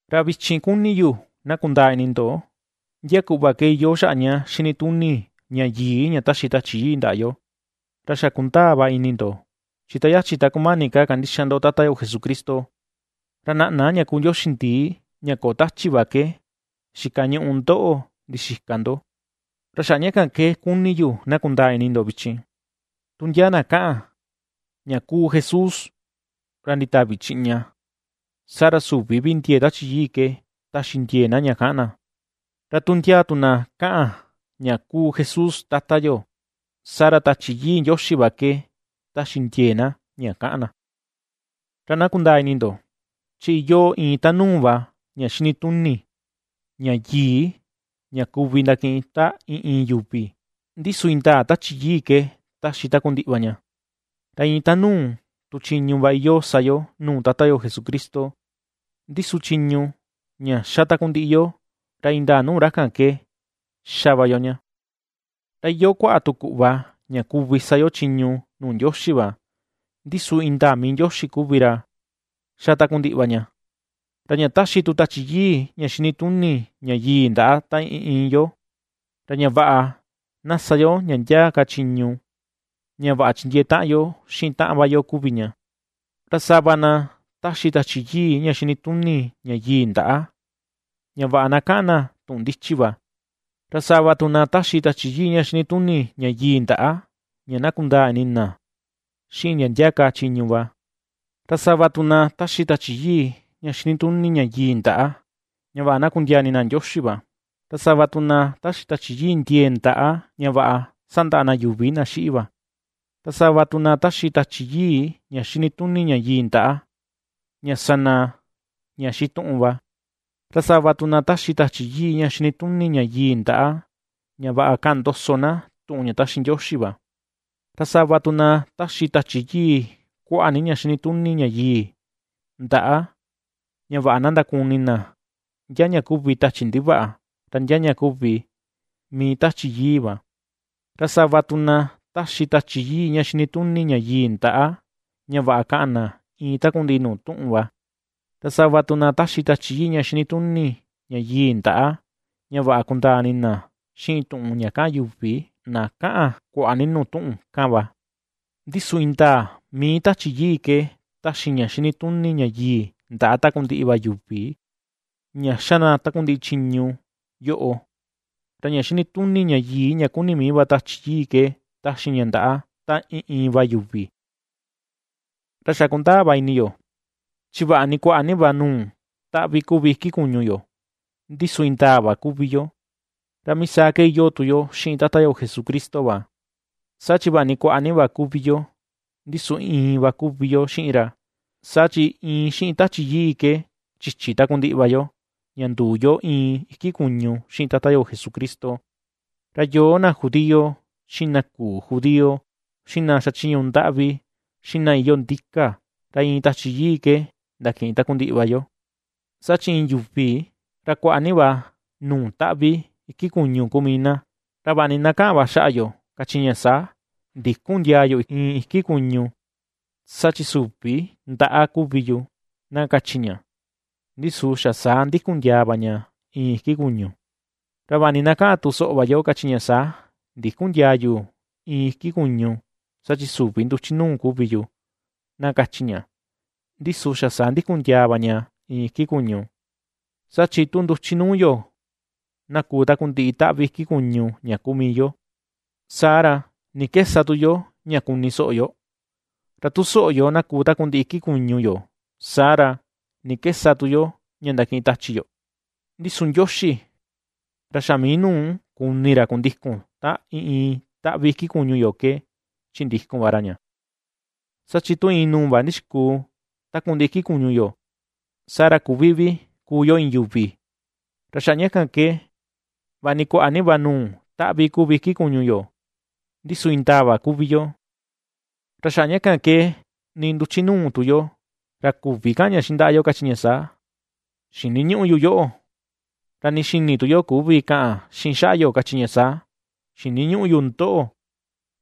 Ra vichin kuni yu na kundaa ini ndo, ndia kuꞌva ke iyoo xaꞌa ña xinituni ña yii ña taxi Tachi Yii ndaꞌa yo. Ra xa kundaa va ini ndo, chi ta yachi ta kumani ka kandixa ndo Tata yo Jesucristo, ra naꞌna ña kuu ndioxi ndii, ña köo tachi va ke, xikañuꞌu ndoꞌo, ndixika ndo. Ra xaꞌa ña kan ke kuni yu na kundaa ini ndo vichin, tu ndia na kaꞌan: “¡Ña kuu Jesús ra nditavi chiꞌña!”, saa ra süvi vi ndiee Tachi Yii ke ^taxi ndiee na ña kaꞌan na. Ra tu ndia tu na kaꞌan: “¡Ña kuu Jesús Tata yo!”, saa ra Tachi Yii Ndioxi va ke ^taxi ndiee na ña kaꞌan na. Ra na kundaa ini ndo, chi iyoo iin tanuu va ña xinituni ña yii ña kuvi ndakiꞌin ta iin, iin yuvi, ndi su indaa Tachi Yii ke taxi takundiꞌi va ña. Ra iin tanuu tu chiñu va iyoo sa yo nuu Tata yo Jesucristo, ndi su chiñu ña xa takundiꞌi yo, ra indaa nuu ra kan ke xa va yo ña. Ra iyoo kuaꞌa tu kuꞌva ña kuvi sa yo chiñu nuu Ndioxi va, ndi su indaa mii Ndioxi kuvi ra ^xa takundiꞌi va ña. Ra ña taxi tu Tachi Yii ña xinituni ña yii ndaꞌa ta iin, iin yo, ra ña vaꞌa na sa yo ndia ndia ka chiñu, ña vaꞌa chindiee taꞌan yo xiꞌin taꞌan va yo kuvi ña. Ra sava na ^taxi Tachi Yii ña xinituni ña yii ndaꞌa, ña vaꞌa na kaꞌan na tuꞌun ndichi va. Ra sava tu na ^taxi Tachi Yii ña xinituni ña yii ndaꞌa ña na kundaa ni ini na xiꞌin ndia ndia ka chiñu va. Ra sava tu na ^taxi Tachi Yii ña xinituni ña yii ndaꞌa, ña vaꞌa na kundiaa ini na Ndioxi va, ra sava tu na ^taxi Tachi Yii ndiee ndaꞌa, ña vaꞌa sandaꞌa na yuvi na xiꞌi va. Ra sava tu na ^taxi Tachi Yii ña xinituni ña yii ndaꞌa, ña sa na ña xituꞌun va, ra sava tu na ^taxi Tachi Yii ña xinituni ña yii ndaꞌa, ña vaꞌa kaꞌan ndoso na tuꞌun ña ^taxi Ndioxi va. Ra sava tu na ^taxi Tachi Yii kuaꞌa ni ña xinituni ña yii ndaꞌa, ña vaꞌa na ndakuni na ndia ña kuvi tachi ndivaꞌa, ra ndia ña kuvi mii Tachi Yii va; ra sava tu na ^taxi Tachi Yii ña xinituni ña yii ndaꞌa, ña vaꞌa kaꞌan na iin takundiꞌi nuu tuꞌun va; ra sava tu na taxi Tachi Yii ña xinituni ña yii ndaꞌa, ña vaꞌa kundaa ini na xiꞌin tuꞌun ña kaꞌan yuvi na kaꞌan kuaꞌa ni nuu tuꞌun kan va. Ndi su indaa mii Tachi yii ke taxi ña xinituni ña yii ndaꞌa takundiꞌi va yuvi ña ^xa na takundiꞌi chiñu yoꞌo, ra ña xinituni ña yii ña kuni mii va Tachi Yii ke taxi ña ndaꞌa ta iin, iin va yuvi. Ra xa kundaa va ini yo, chi vaꞌa ni kuaꞌa ni va nuu taꞌvi kuvi iki kuñu yo, ndi su indaa va kuvi yo; ra mii saa ke iyoo tu yo xiꞌin Tata yo Jesucristo va, saa chi vaꞌa ni kuaꞌa ni va kuvi yo, ndi su iin va kuvi yo xiꞌin ra. Saa chi iin xiꞌin Tachi Yii ke chichi takundiꞌi va yo ña nduu yu iin iki kuñu xiꞌin Tata yo Jesucristo, ra yoo na judío, xiꞌin na küu judío, xiꞌin na xachiñu ndaꞌvi, xiꞌin na iyoo ndika, ra iin Tachi Yii ke ndakiꞌin takundiꞌi va yo. Saa chi iin yuvi, ra kuaꞌa ni va nuu taꞌvi iki kuñu kuu mii na. Ra vaꞌa ni na ^kaꞌan va xaꞌa yo, kachi ña saa: “Ndïkun ndiaa yu iin iki kuñu, saa chi süvi ndaꞌa kuvi yu”, na kachi ña, ndi su xa saa ndikun ndiaa va ña iin iki kuñu. Ra vaꞌa ni na ^kaꞌan tu soꞌo va yo, kachi ña saa: “Ndïkun ndiaa yu iin iki kuñu, saa chi süvi nduchi nuu kuvi yu”, na kachi ña, ndi su xa saa ndikun ndiaa va ña iin iki kuñu. Saa chi tu nduchi nuu yo, na kuu takundiꞌi taꞌvi iki kuñu ña kuu mii yo, saa ra, ¿ni ke sa tu yo ña kuni soꞌo yo? Ra tu soꞌo yo, na kuu takundiꞌi iki kuñu yo, saa ra, ¿ni ke sa tu yo ña ndakiꞌin tachi yo? Ndi su Ndioxi, ra xa mii nuu kuni ra kundikun ta iin, iin taꞌvi iki kuñu yo ke chindikun va ra ña. Saa chi tu iin nuu va ndixikuu takundiꞌi iki kuñu yo, saa ra küvi vi kuu yo iin yuvi. Ra xaꞌa ña kan ke, vaꞌa ni kuaꞌa ni va nuu taꞌvi kuvi iki kuñu yo, ndi su indaa va kuvi yo. Ra xaꞌa ña kan ke nii nduchi nuu tu yo, ra küvi kaꞌan ña xiꞌin ndaꞌa yo, kachi ña saa: “Xiniñüꞌu yu yoꞌo”; ra nii xini tu yo küvi kaꞌan xiꞌin xaꞌa yo, kachi ña saa: “Xiniñüꞌu yu ndoꞌo.”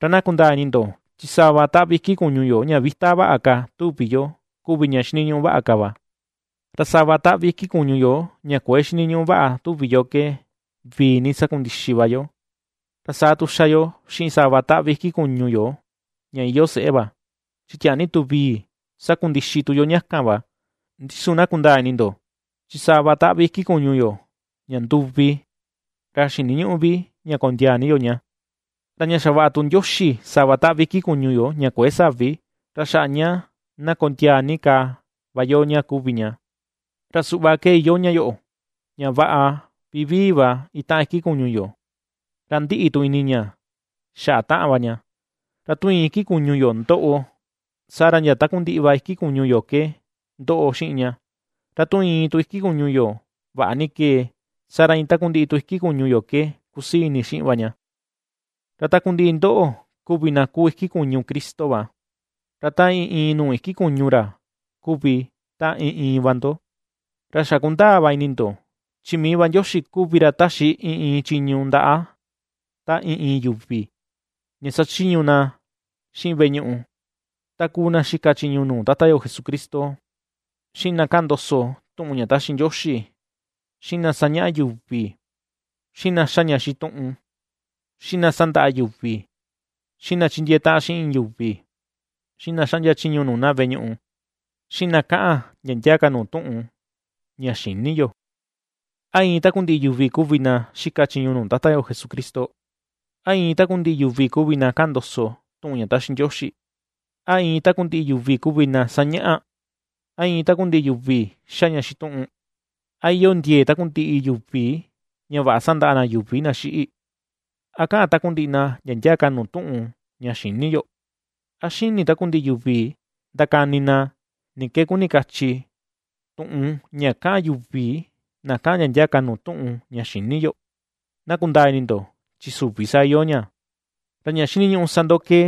Ra na kundaa ini ndo, chi sava taꞌvi iki kuñu yo ña vita vaꞌa ka tuvi yo, kuvi ña xiniñuꞌu vaꞌa ka va; Ra sava taꞌvi iki kuñu yo ña kuëe xiniñuꞌu vaꞌa tuvi yo ke, vii ni sakundixi va yo. Ra saa tu ^xa yo xiꞌin sava taꞌvi iki kuñu yo ña iyoo seꞌé va, chi tiaa ni tu vii sakundixi tu yo ña kan va. Ndi su na kundaa ini ndo, chi sava taꞌvi iki kuñu yo, ña nduvi, ra xiniñüꞌu vi ña kondiaa ni yo ña. Ra ña xavaꞌa tu Ndioxi sava taꞌvi iki kuñu yo ña kuëe savi, ra xaꞌa ña na kondiaa ni ka va yo ña kuvi ña. Ra suꞌva ke iyoo ña yoꞌo, ña vaꞌa vivii va itaꞌan iki kuñu yo, ra ndiꞌi tu ini ña xaꞌa taꞌan va ña. Ra tu iin iki kuñu yo ^ndoꞌo, saa ra ndia takundiꞌi va iki kuñu yo ke ^ndoꞌo xiꞌin ña; ra tu iin tu iki kuñu yo vaꞌa ni kee, saa ra iin takundiꞌi tu iki kuñu yo ke ^kusii ini xiꞌin va ña. Ra takundiꞌi ndoꞌo kuvi na kúu iki kuñu Cristo va, ra ta iin, iin nuu iki kuñu ra kuvi ta iin, iin va ndo. Ra xa kundaa va ini ndo, chi mii va Ndioxi kuvi ra ^taxi iin, iin chiñu ndaꞌa ta iin, iin yuvi, ña sachiñu na xiꞌin veꞌe ñuꞌu: ta kuu na xika chiñu nuu Tata yo Jesucristo, xiꞌin na kaꞌan ndoso tuꞌun ña ^taxi Ndioxi, xiꞌin na sañaꞌa yuvi, xiꞌin na ^xa ña xituꞌun, xiꞌin na ^sandaꞌa yuvi, xiꞌin na ^chindiee taꞌan xiꞌin yuvi, xiꞌin na xaꞌndia chiñu nuu na veꞌe ñuꞌu, xiꞌin na kaꞌan ndia ndia ka nuu tuꞌun ña xïni yo. ¿A iin takundiꞌi yuvi kuvi na xika chiñu nuu Tata yo Jesucristo? ¿A iin takundiꞌi yuvi kuvi na kaꞌan ndoso tuꞌun ña taxi Ndioxi? ¿A iin takundiꞌi yuvi kuvi na sañaꞌa? ¿A iin takundiꞌi yuvi ^xa ña xituꞌun? ¿A iyoo ndiee takundiꞌi yuvi ña vaꞌa sandaꞌa na yuvi na xiꞌi? ¿A kaꞌan takundiꞌi na ndia ndia ka nuu tuꞌun ña xïni yo? ¿A xini takundiꞌi yuvi ndakani na ni ke kuni kachi, tuꞌun ña kaꞌan yuvi na kaꞌan ndia ndia ka nuu tuꞌun ña xïni yo? Na kundaa ini ndo, chi süvi saa iyoo ña. Ra ña xiniñuꞌu sa ndo ke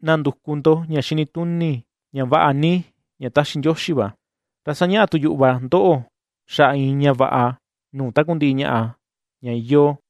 na nduku ndo ña xinituni, ña vaꞌa ni, ña taxi Ndioxi va; ra sañaꞌa tu yuꞌu va ndoꞌo xaꞌa iin ña vaꞌa nuu takundiꞌi ñaꞌa ña iyoo.